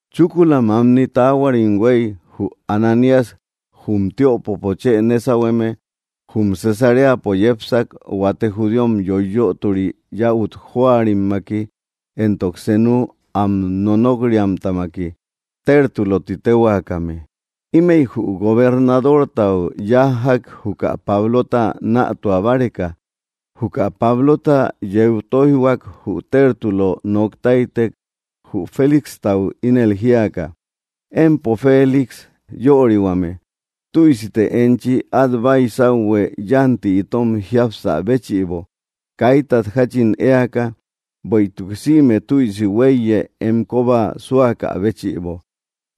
Chúkula mamni taáhuarim huei, jü Ananías, jum tiöpopo chë nésauhueme, jum Cesaréapo yépsak huate judíom yoiyötori yäut jóarimmaki éntok senu am nonók-riamtamaki, Tértulö ti téhuakame. Ímëi jü gobernadortau yájjak juka Pablota nätua báreka. Juka Pablota yeu tóijhuak, jü Tértulo noktáitek, jü Félixtau ínel jíaka: —Empo Félix yörihuame, tüisite enchi at báisauhue yanti itom jíapsä béchïbo kaítat jachin éaka, bueïtuk sïme tüisi huéiye em koba súakä béchïbo.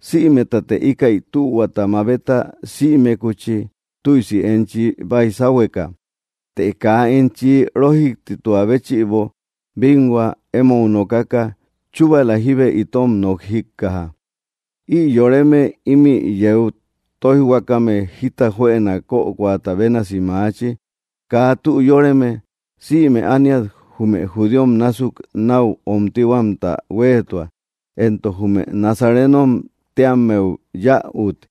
Sïmetate íkäi tühuata mabeta sïmekuchi, tüisi enchi baisáuhueka. Të kaa enchi rójiktitua béchïbo binhua emou nokaka, chúbala jíbe itom nok jíkkaja. Ï yoreme imi yeu tóijhuakame jita juëna kökoata bénasi maachi, kaa tü yóreme. Sïme ániat jume judíom násuk nau omtíhuamta huéetua, éntok jume nazarénom téammeu yäut.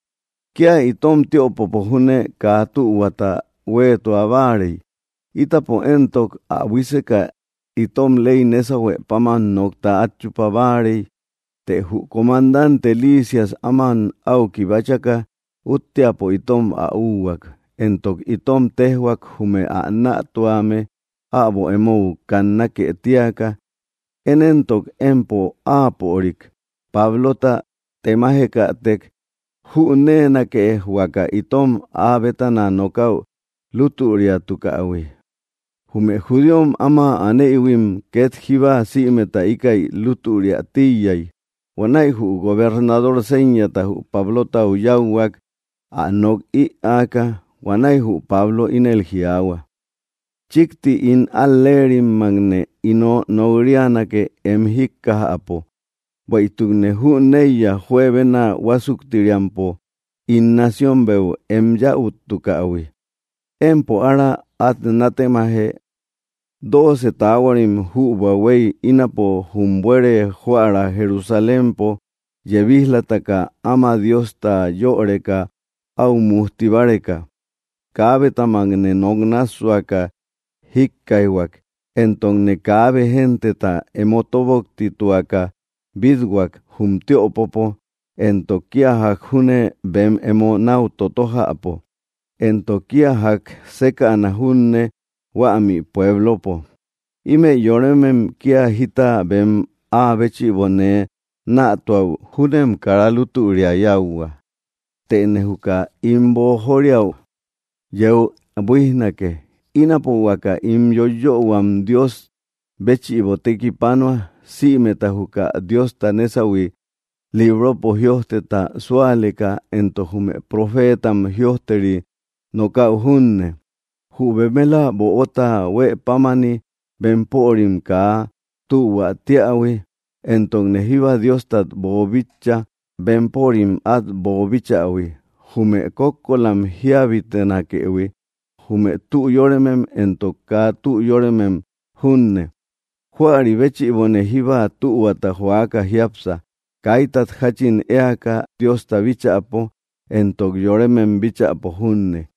Kia itom tiöpopo júne kaa tühuata hueetua báarei. Ítapo éntok, ä buíseka itom ley nésahue páman nokta at chupa báarei. Të jü comandante Lisias áma au kibáchaka útteapo itom ä úhuak, éntok itom téjhuak jume ä nätuame äbo emou kannákë tíaka. Én éntok, empo áapörik, Pablota, temájekätek jünéenake huaka itom áa bétana nokäu lútüriatukähui. Jume judíom áma anéïhuim ket jíba sïmeta íkäi lútüriä tíiyai. Huanäi jü gobernador séñata jü Pablotau yáuhuak ä nok ïaaka. Huanäi jü Pablo ínel jiaahua: —Chikti ín al‑léerimmakne ino nok‑rianake em jíkkajäpo, bueïtukne jüneiya juebena huásuktiriampo ín nacionbeu em yäuttukähui. Empo ára at nátemaje, dóoce taáhuarim jübua hueiy ínapo jum buere joära Jerusalémpo yebíj‑lataka áma Diosta yöreka au mujti báreka. Kaábetamakne nok nássuaka jíkkaijhuak, éntokne kaabe genteta emo tóboktituaka bít-huak jum tiöpopo, éntok kia jak júne bem emo nau totójäpo, éntok kia jak sékäna junne huämi puéblopo. Ímëi yoremem kia jita bem áa béchïbo nee nätuäu júnem karë lútüria yáuhua. Tëne juka ín boojoriau yeu buíjnake. Ínapo huaka ín yóiyöhuam Dios béchïbo tekipanua, sïmeta juka Diosta nésauhui libropo jïojteta súaleka éntok jume profétam jïojteri nokäu junne, jü bemela böta huëpámani, bempörim kaa tühuätíähui. Éntokne jíba Dióstat boobíchaïhui bempörim at boobíchähui, jume kókkolam jíabitenakëhui, jume tü yóremem éntok kaa tü yóremem junne. Juäri béchïbone jíba tühuata jóaka jiápsa, kaítat jachin éaka Diosta bíchäpo éntok yorémem bíchäpo junne.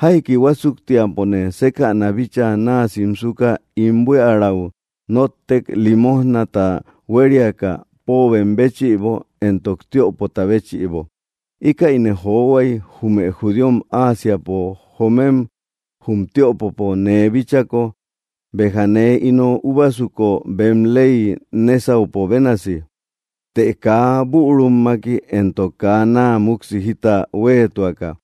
’Jaiki huásuktiapone sékäna bíchaa naa simsuka ín buíarau nóttek limójnata huériaka póobem béchïbo éntok tiöpota béchïbo. Íkäine johuai jume judíom Ásiapo joomem jum tiöpopo nee bíchako, béja nee ino úbasuko bem ley nésauhuëpo bénasi, të kaa bürummaki éntok kaa naa muksi jita huéetuaka.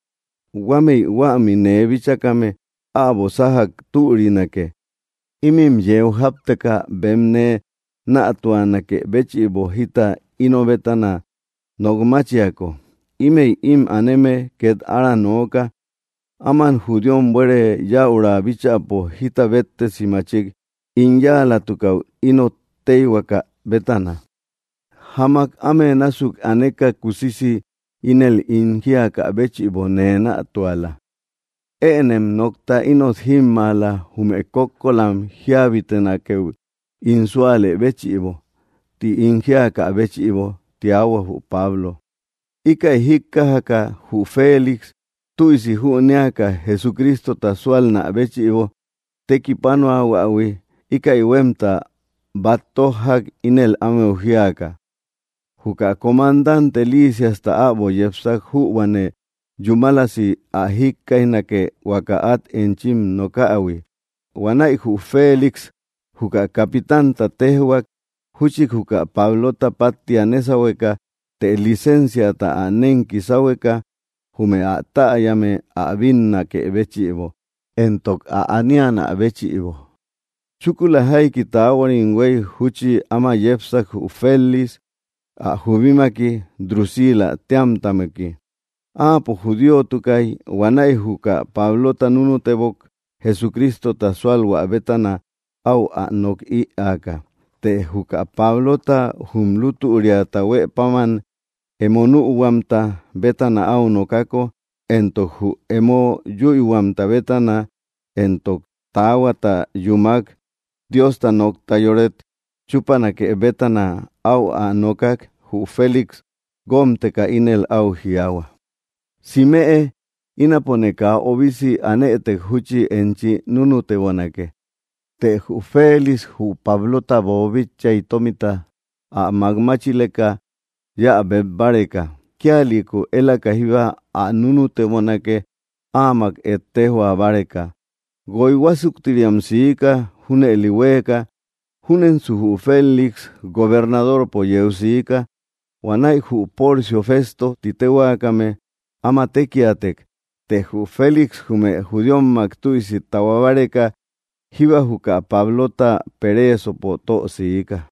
Huámëi huämi nee bíchakame äbo sájak türinake, ímin yeu jápteka bem nee nätuanakë béchïbo jita ino bétana nok máchiako. Ímëi im aneme ket ára nooka áman judíom buere yäura bíchäpo jita béttesi machik ín yáalatukäu ínot téihuaka bétana. Jamak áme násuk aneka kusisi ínel ín jíakä béchïbo nee nätuala: “Ënem nokta ínot jímmaala jume kókkolam jíabitenakeu ín súalë béchïbo”, ti ín jíakä béchïbo —tiahua jü Pablo. Íkäi jíkkajaka jü Félix, tüisi jünéaka Jesucrístota súalnä béchïbo tekipánoahuähui, íkäi huemta bat tójjak ínel ámeu jíaka: —Juka comandante Lísiasta äbo yepsak jübuane yúmalasi ä jikkaijnake huaka at enchim nokähui. Huanäi jü Félix juka capitanta téjhuak júchi juka Pablota pattia nésauhueka, të licénciata ä nenki sáhueka jume ä täyame ä bínnakë béchïbo, éntok ä aníanä béchïbo. Chúkula jaiki taáhuarim huei, júchi áma yépsak jü Félix ä jubímaki, Drusílä téamtamaki. Áapo judíotukay. Huanäi juka Pablota núnutebok Jesucrístota súalhuä bétana áu ä nok ïaaka. Të juka Pablota jum lútüriata huë páman emo nühuamta bétana au nokako, éntok jü emo yüihuamta bétana éntok taahuata yúmak, Diosta nokta yóret chúpanake bétana áu ä nookak, jü Félix guómteka ínel au jiaahua: —Simëe, ínapone kaa obisi anëtek, júchi enchi núnutebonake. Të jü Félix jü Pablótat boobíchaïhuii tómita ä makmáchileka yéä beb báreka; kíalïku élaka jíba ä núnutebonake áamak ettéjhua báreka. Guoi huásuktiriam siika junëli huéeka. Júnensu jü Félix gobernadorpo yeu siika, huanäi jü Porcio Fésto ti téhuakame áma tékiatek. Të jü Félix jume judíommak tüisi tahuá báreka jíba juka Pablota pereesopo tö siika.